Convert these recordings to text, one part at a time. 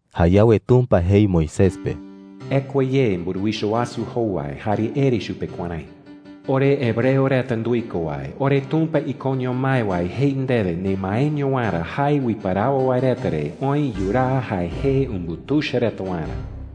Jayawe Tumpa jei Moisés pe: “Ekua ye mburuwicha wasu jowai jare ere chupe kuärái: ‘Ore hebreo reta nduiko wae, oreTumpa ikoño mái wae jei ndewe nemaeño waerä jae uiparawo wae reta re oë yuraa jae jee umbutuicha reta waerä.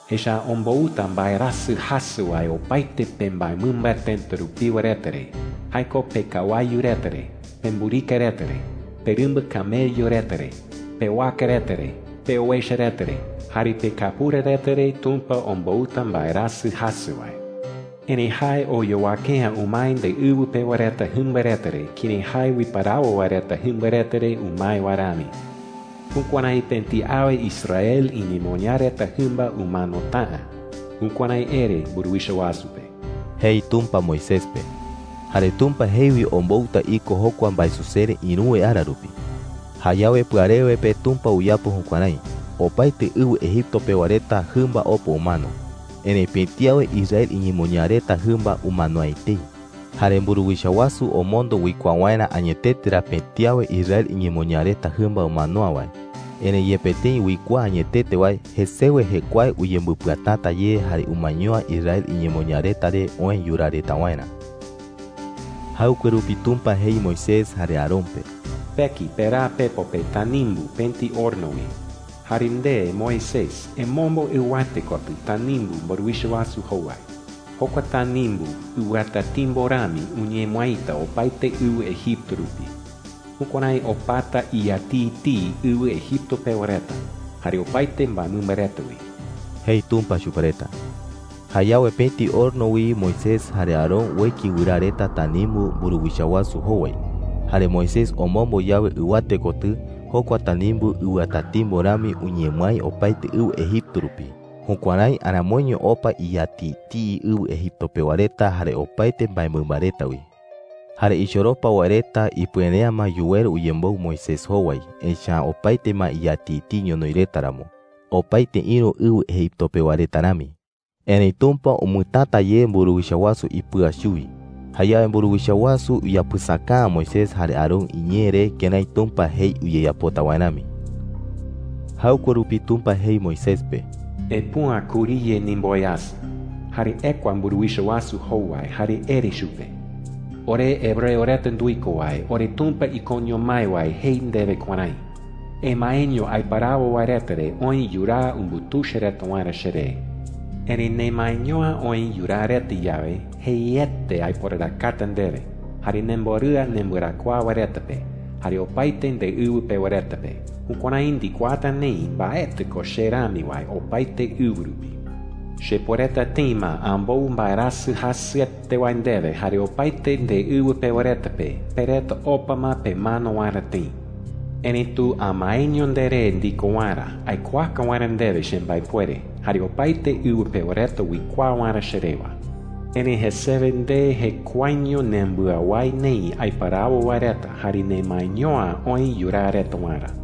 Echa’ä ombouta mbaerasɨ jasɨ wae opaete pembaemɨmba tëta rupiwa reta re – jae ko pekawayu reta re, pemburika reta re, perɨmba camello reta re, pewaka reta re, peowecha reta re, jare pekapura reta re Tumpa ombouta mbaerasɨ jasɨ wae. Erëi jae oyowake’ä umae ndeɨwɨ pewa reta jɨmba reta re kërái jae uiparawo wae reta jɨmba reta re umae wae rami. Jukuärái pëti awe Israel iñemoñaa reta jɨmba umanota’ä.’ Jukuärái ere mburuwicha wasu pe,” jei Tumpa Moisés pe. Jare Tumpa jei wi ombouta iko jokua mbaesusere ïruwe ara rupi. Jayawe pɨarewe pe Tumpa uyapo jukuärái. Opaete ɨwɨ Egipto pewa reta jɨmba opa umano. Erëi pëti awe Israel iñemoñaa reta jɨmba umano’ä etei. Jare mburuwicha wasu omondo uikuaa waerä añetete ra pëti awe Israel iñemoñaa reta jɨmba umano’ä wae. Erëi yepe tëi uikuaa añetete wae, jesewe jekuae uyembɨpɨatäta ye jare umaeño’ä Israel iñemoñaa reta re oë yuraa reta waerä. Jaɨkue rupi Tumpa jei Moisés jare Aarón pe: “Peki peraa pepo pe tanimbu pëti horno wi,” jei. “Jare nde, Moisés, emombo ɨwate kotɨ tanimbu mburuwicha wasu jowai. Jokua tanimbu ɨwɨatatimbo rami uñemɨaita opaete ɨwɨ Egipto rupi. Jukuärái opata iyatiitii ɨwɨ Egipto pewa reta jare opaete mbaemɨmba reta wi,” jei Tumpa chupe reta. Jayawe pëti horno wi Moisés jare Aarón ueki wɨraa reta tanimbu mburuwicha wasu jowai. Jare Moisés omombo yawe ɨwate kotɨ, jokua tanimbu ɨwɨatatimbo rami uñemɨái opaete ɨwɨ Egipto rupi. Jukuärái aramoiño opa iyatiitii ɨwɨ Egipto pewa reta jare opaete mbaemɨmba reta wi. Jare ichoropa wae reta ipuere’ä ma yuweru uyemboɨ Moisés jowai, echa’ä opaete ma iyatiitii ñonoï reta ramo, opaete ïru ɨwɨ Egipto pewa reta rami. Erëi Tumpa umɨtäta ye mburuwicha wasu ipɨa chuwi. Jayawe mburuwicha wasu uyapɨsaka’ä Moisés jare Aarón iñee re kërái Tumpa jei uyeyapota wae rami. Jaɨkue rupi Tumpa jei Moisés pe: “Epüa kuriye ndimboweasɨ, jare ekua mburuwicha wasu jowai jare ere chupe: ‘Ore hebreo reta nduiko wae, oreTumpa ikoño mái wae jei ndewe kuärái: ‘Emaeño aiparawo wae reta re oë yuraa umbutuicha reta waerä cheree. Erëi nemaeño’ä oë yuraa reta yawe, jeiete aiporarakata ndewe, jare nemborɨa nembɨarakuaa wae reta pe, jare opaete ndeɨwɨ pewa reta pe. Jukuärái ndikuaata neï mbaetɨ ko che rami wae opaete ɨwɨ rupi. Chepuereta tëi ma ambou mbaerasɨ jasɨete wae ndewe jare opaete ndeɨwɨ pewa reta pe, pe reta opa ma pemano waerä tëi. Erëitu amaeño nderé ndiko waerä aikuaaka waerä ndewe chembaepuere, jare opaete ɨwɨ pewa reta uikuaa waerä che rewa. Erëi jesewe nde jekuaeño nembɨawái neï aiparawo wae reta jare nemaeño’ä oë yuraa reta waerä.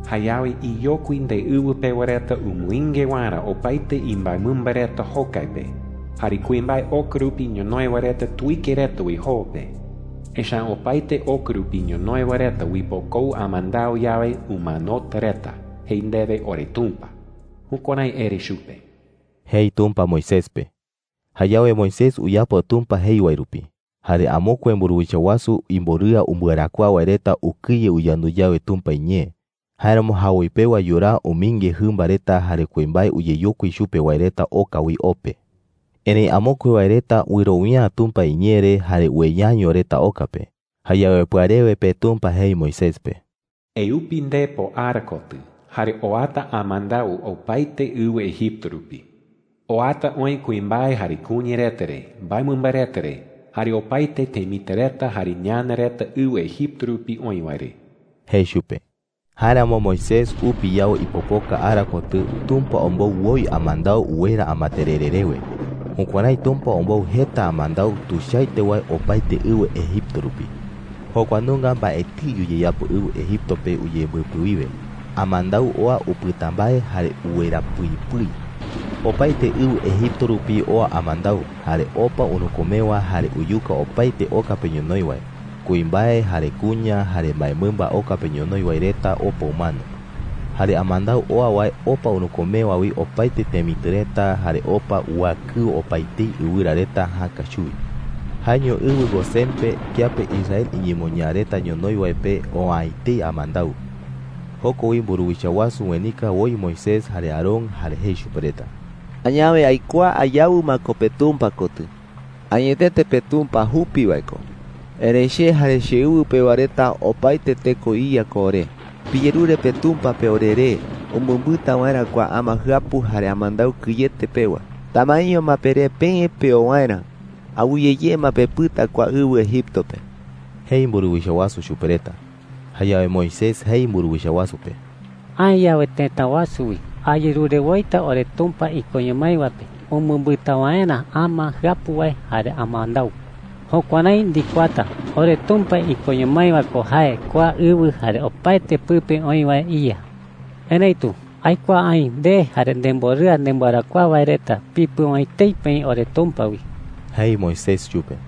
Jayawe iyokui ndeɨwɨ pewa reta umɨinge waerä opaete imbaemɨmba reta jokai pe, jare kuimbae oka rupi ñonoï wae reta tuike reta wi joo pe. Echa’ä opaete oka rupi ñonoï wae reta uipokou amandau yawe, umanota reta,’ jei ndewe oreTumpa.’ Jukuärái ere chupe,” jei Tumpa Moisés pe. Jayawe Moisés uyapo Tumpa jei wae rupi. Jare amokue mburuwicha wasu imborɨa umbɨarakuaa wae reta ukɨye uyandu yawe Tumpa iñee. Jáeramo jawoi pewa yuraa umɨinge jɨmba reta jare kuimbae uyeyokui chupe wae reta oka wi o pe. Erëi amokue wae reta wɨrowia’ä Tumpa iñee re jare ueyaño reta oka pe. Jayawe pɨarewe pe Tumpa jei Moisés pe: “Eupi ndepo ara kotɨ, jare oata amandau opaete ɨwɨ Egipto rupi. Oata oï kuimbae jare kuña reta re, mbaemɨmba reta re, jare opaete temitɨ reta jare ñana reta ɨwɨ Egipto rupi oï wae re,” jei chupe. Jáeramo Moisés upi yawe ipopoka ara kotɨ, Tumpa ombou woi amandau uwera amaterere rewe. Jukuärái Tumpa ombou jeta amandau tuichaete wae opaete ɨwɨ Egipto rupi. Jokua nunga mbaetɨi uyeyapo ɨwɨ Egipto pe uyembɨpɨ wiwe. Amandau oa upɨta mbae, jare uwera pɨi pɨi. Opaete ɨwɨ Egipto rupi oa amandau, jare opa urükumewa jare uyuka opaete oka pe ñonoï wae. Kuimbae jare kuña jare mbaemɨmba oka pe ñonoï wae reta opa umano. Jare amandau oa wae opa urükumewa wi opaete temitɨ reta, jare opa uakɨo opaetei ɨwɨra reta jäka chuwi. Jaeño ɨwɨ Gosén pe, kiape Israel iñemoñaa reta ñonoï wae pe, oa’ä etei amandau. Joko wi mburuwicha wasu uenika woi Moisés jare Aarón, jare jei chupe reta: “Añawe aikuaa ayawɨ ma ko peTumpa kotɨ. Añetete peTumpa jupi wae ko, erëi che jare cheɨwɨ pewa reta opaete teko iya ko ore. Piyerure peTumpa pe oreré umɨmbɨta waerä kua ama jɨapu jare amandau kɨyete pewa. Tamaeño ma peré peë peo waerä. Awɨye ye ma pepɨta kua ɨwɨ Egipto pe,” jei mburuwicha wasu chupe reta. Jayawe Moisés jei mburuwicha wasu pe: “Aë yawe tëta wasu wi, ayerure woita oreTumpa ikoño mái wae pe umɨmbɨta waerä ama jɨapu wae jare amandau,” jei. “Jukuärái ndikuaata oreTumpa ikoño mái wae ko jae kua ɨwɨ jare opaete pɨpe oï wae iYa,” jei. “Erëitu aikuaa aï nde jare nemborɨa nembɨarakuaa wae reta pipɨu’ä etei peï oreTumpa wi,” jei Moisés chupe.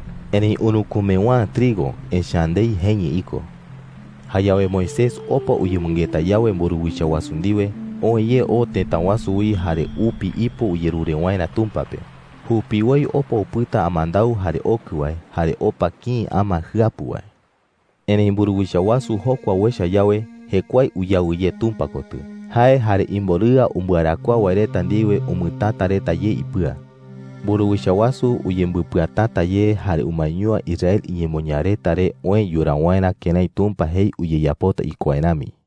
Erëi urükumewa’ä trigo, echa’ä ndei jeñɨ iko. Jayawe Moisés opa uyemɨngeta yawe mburuwicha wasu ndiwe, oë ye oo tëta wasu wi jare upi ipo uyerure waerä Tumpa pe. Jupiwoi opa upɨta amandau jare okɨ wae, jare opa kïi ama jɨapu wae. Erëi mburuwicha wasu jokua uecha yawe, jekuae uyawɨ ye Tumpa kotɨ. Jae jare imborɨa umbɨarakuaa wae reta ndiwe umɨtäta reta ye ipɨa. Mburuwicha wasu uyembɨpɨatäta ye jare umaeño’ä Israel iñemoñaa reta re oë yuraa waerä kërái Tumpa jei uyeyapota iko wae rami.